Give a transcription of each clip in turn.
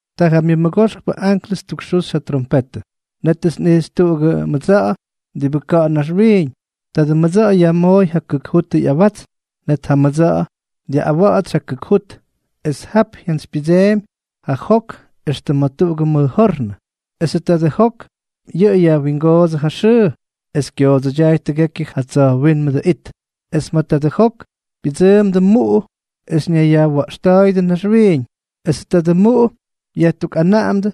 Ta ja myʉmʉgoxkpʉ anklʉs ttukxuxy ja trompetʉ. Nétʉts nꞌijxy tuꞌugʉ mʉdsa̱ꞌa̱ diꞌibʉ ka̱ꞌa̱ naxwiiñ. Tadʉ mʉdsa̱ꞌa̱ yajmooy ja kʉk jutʉ ꞌyawatsn. Net ja mʉdsa̱ꞌa̱ dyaꞌꞌawatsy ja kʉk jut, es jap jyantsypyʉdseemy ja jok éxtʉm ma̱ tuꞌugʉ mʉj jornʉ. Esʉ tadʉ jok yʉꞌʉ yajwingoodsʉ ja xʉʉ, es kyoodsʉdyaay tʉgekyʉ ja tsa̱jwínmʉdʉ it. Es ma̱ tadʉ jok pyʉdsʉʉmdʉ muꞌu es ñaywya̱ꞌxta̱a̱yʉdʉ naxwiiñ. Esʉ tadʉ muꞌu yajtukꞌanaꞌamdʉ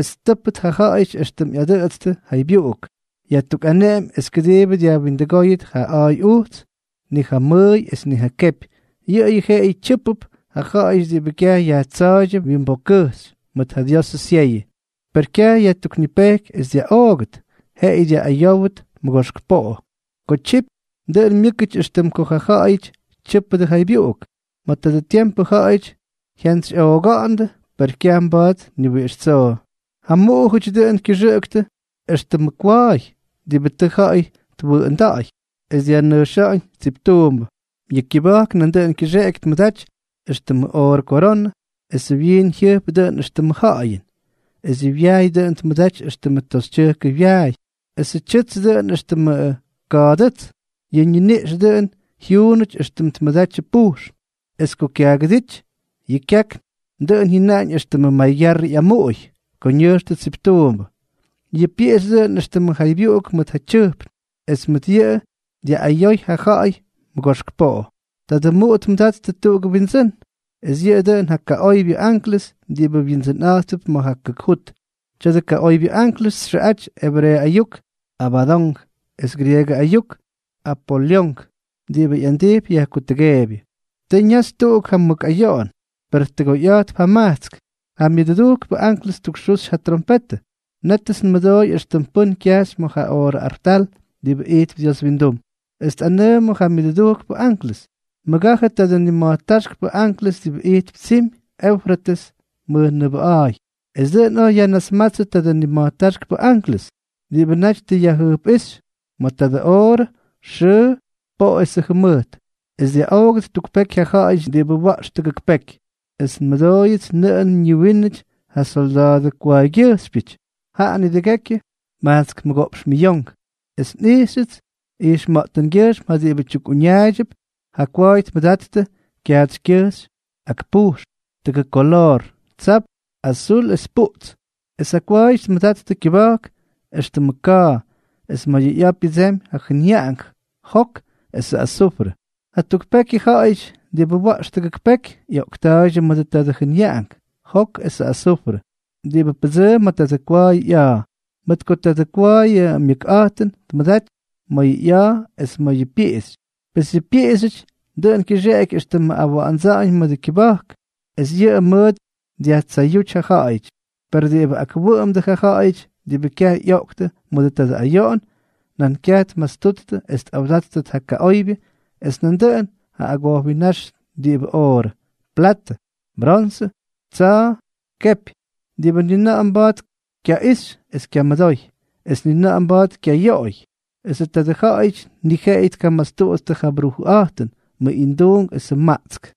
es ttʉ́pʉt ja ja̱ꞌa̱yʉty éxtʉm ꞌyadʉꞌʉtstʉ jaybyuꞌuk, yajtukꞌaneꞌemy es kʉdiibʉ dyajwindʉgóyʉt ja a̱a̱y ujts, ni ja mʉʉy es ni ja kepy, yʉꞌʉyʉ jeꞌeyʉ tyʉ́pʉp ja ja̱ꞌa̱yʉty diꞌibʉ kyaj yajtsa̱a̱ydyʉ wyimbokkʉjxy mʉt ja Diosʉ syeyʉ. Per kyaj yajtuknipejky es dyaꞌoogʉt, jeꞌeyʉ dyaꞌꞌayówʉt mʉgoxk poꞌo. Ko tyipy, dʉꞌʉn myʉ́kʉty éxtʉm ko ja ja̱ꞌa̱yʉty tyʉ́pʉdʉ jaybyuꞌuk. Ma̱ tadʉ tiempʉ ja̱ꞌa̱yʉty jyantsyjyaꞌoogándʉ, per kyaj mba̱a̱t ni wiꞌix tsoo. Ja muꞌujʉty dʉꞌʉn kyʉxʉꞌʉktʉ éxtʉmʉ kwa̱a̱y diꞌibʉ tʉ ja̱ꞌa̱y twʉꞌʉnda̱ꞌa̱y es dyajnʉjxa̱ꞌa̱ñ tsiptuumbʉ. Yʉ kyʉba̱jk nandʉꞌʉn kyʉxeꞌeky tmʉdaty éxtʉmʉ oorʉ koronʉ, esʉ wyiin jyʉjp dʉꞌʉn éxtʉmʉ ja̱ꞌa̱yʉn. Es yʉ wyaay dʉꞌʉn tmʉdaty éxtʉmʉ toxytyʉjkʉ wyaay, esʉ tyʉts dʉꞌʉn éxtʉmʉ ka̱a̱dʉ́ts. Yʉ ñiniꞌx dʉꞌʉn jyuunʉty éxtʉm tmʉdatyʉ pujxn. Es ko kyaagʉdíty, yʉ kyakn dʉꞌʉn jyʉnaꞌañ éxtʉm ko yʉ maygyarrʉ ꞌyamuꞌuy ko ñʉjxtʉ tsiptuumbʉ. Yʉ pyiꞌixy dʉꞌʉn éxtʉmʉ jaybyuꞌuk mʉt ja tyʉjpn, es mʉt yʉꞌʉ dyaꞌꞌayoy ja ja̱ꞌa̱y mʉgoxk poꞌo. Tadʉ muꞌu tmʉdattʉ tuꞌugʉ wyindsʉ́n, es yʉꞌʉ dʉꞌʉn ja kaꞌoybyʉ anklʉs diꞌibʉ windsʉnꞌa̱jtp ma̱ ja kʉk jut. Tya̱dʉ kaꞌoybyʉ anklʉs txʉꞌaty ebreeʉ ayuk Abadonk es grieegʉ ayuk Apolyonk, diꞌibʉ ꞌyandijpy yajkutʉgeebyʉ. Tʉ ñaxy tuꞌuk ja mʉk ayoꞌon, per tʉgoyꞌa̱jtp jamajtsk. Ta ja myʉdʉdujkpʉ anklʉs ttukxuxy ja trompetʉ. Nétʉts nmʉdooy éxtʉm pʉ́n kyajxy ma̱ ja oorʉ artal diꞌibʉ ijtp Dios windum, es tꞌanʉʉmʉ ja myʉdʉdujkpʉ anklʉs: —Mʉgajʉ tadʉ nima̱jtáxkpʉ anklʉs diꞌibʉ ijtp tsimy Eufrates mʉjnʉʉbʉꞌa̱a̱y. Es dʉꞌʉn oj yajnasmátsʉdʉ tadʉ nima̱jtáxkpʉ anklʉs diꞌibʉ naty tʉ yajjʉjpꞌíxy ma̱ tadʉ oorʉ, xʉʉ, poꞌo esʉ jʉmʉjt, es dyaꞌoogʉt tuk peky ja ja̱ꞌa̱yʉty diꞌibʉ wa̱ꞌx tʉgʉk peky. Es nmʉdooyʉts nʉꞌʉn ñiwínʉty ja solda̱a̱dʉ kwa̱a̱ygyʉjxypyʉty, jaꞌa nidʉgékyʉty majtsk mʉgoꞌpx miyonk. Es nꞌijxyʉts ijxma̱ꞌtʉngyʉjxm ja diꞌibʉ tyukꞌuñaaydyʉp ja kwa̱a̱y tmʉdattʉ kyaatsykyʉjxy ak pujxn, tʉgʉk kolor: tsapts, azul es puꞌts. Es ja kwa̱a̱yʉty tmʉdattʉ kyʉba̱jk éxtʉmʉ ka̱a̱, es ma̱ ꞌya̱a̱ pyʉdsemy ja jʉnyaꞌank, jok esʉ azufrʉ. Ja tuk pekypyʉ ja̱ꞌa̱yʉty diꞌibʉ wa̱ꞌx tʉgʉk peky ꞌyoꞌkta̱a̱ydyʉ mʉdʉ tadʉ jʉnyaꞌank, jok esʉ azufrʉ, diꞌibʉ pʉdsʉʉm ma̱ tadʉ kwa̱a̱yʉ ꞌya̱a̱. Mʉt ko tadʉ kwa̱a̱yʉ myʉkꞌa̱jtʉn tmʉdaty ma̱ yʉ ꞌya̱a̱ es ma̱ yʉ pyiꞌixy. Pes yʉ pyiꞌixyʉty dʉꞌʉn kyʉxeꞌeky éxtʉmʉ awa̱ꞌa̱ndsa̱ꞌa̱ñ mʉdʉ kyʉba̱jk. Es yʉꞌʉ mʉt dyajtsayúty ja ja̱ꞌa̱yʉty. Per diꞌibʉ akwʉꞌʉmdʉ ja ja̱ꞌa̱yʉty diꞌibʉ kyaj ꞌyoꞌktʉ mʉdʉ tadʉ ayoꞌon, nan kyaj tmastuttʉ es tꞌawdáttʉt ja kaꞌoybyʉ es nandʉꞌʉn ja agojwinnáx diꞌibʉ oorʉ, platʉ, bronsʉ, tsa̱a̱, kepy, diꞌibʉ ni na̱ꞌa̱ mba̱a̱t kyaꞌixy es kyamʉdoy, es ni na̱ꞌa̱ mba̱a̱t kyayoꞌoy. Esʉ tadʉ ja̱ꞌa̱yʉty ni jeꞌeyʉ tkamastuttʉ ja brujʉꞌa̱jtʉn, mʉꞌinduunk esʉ maꞌtsk.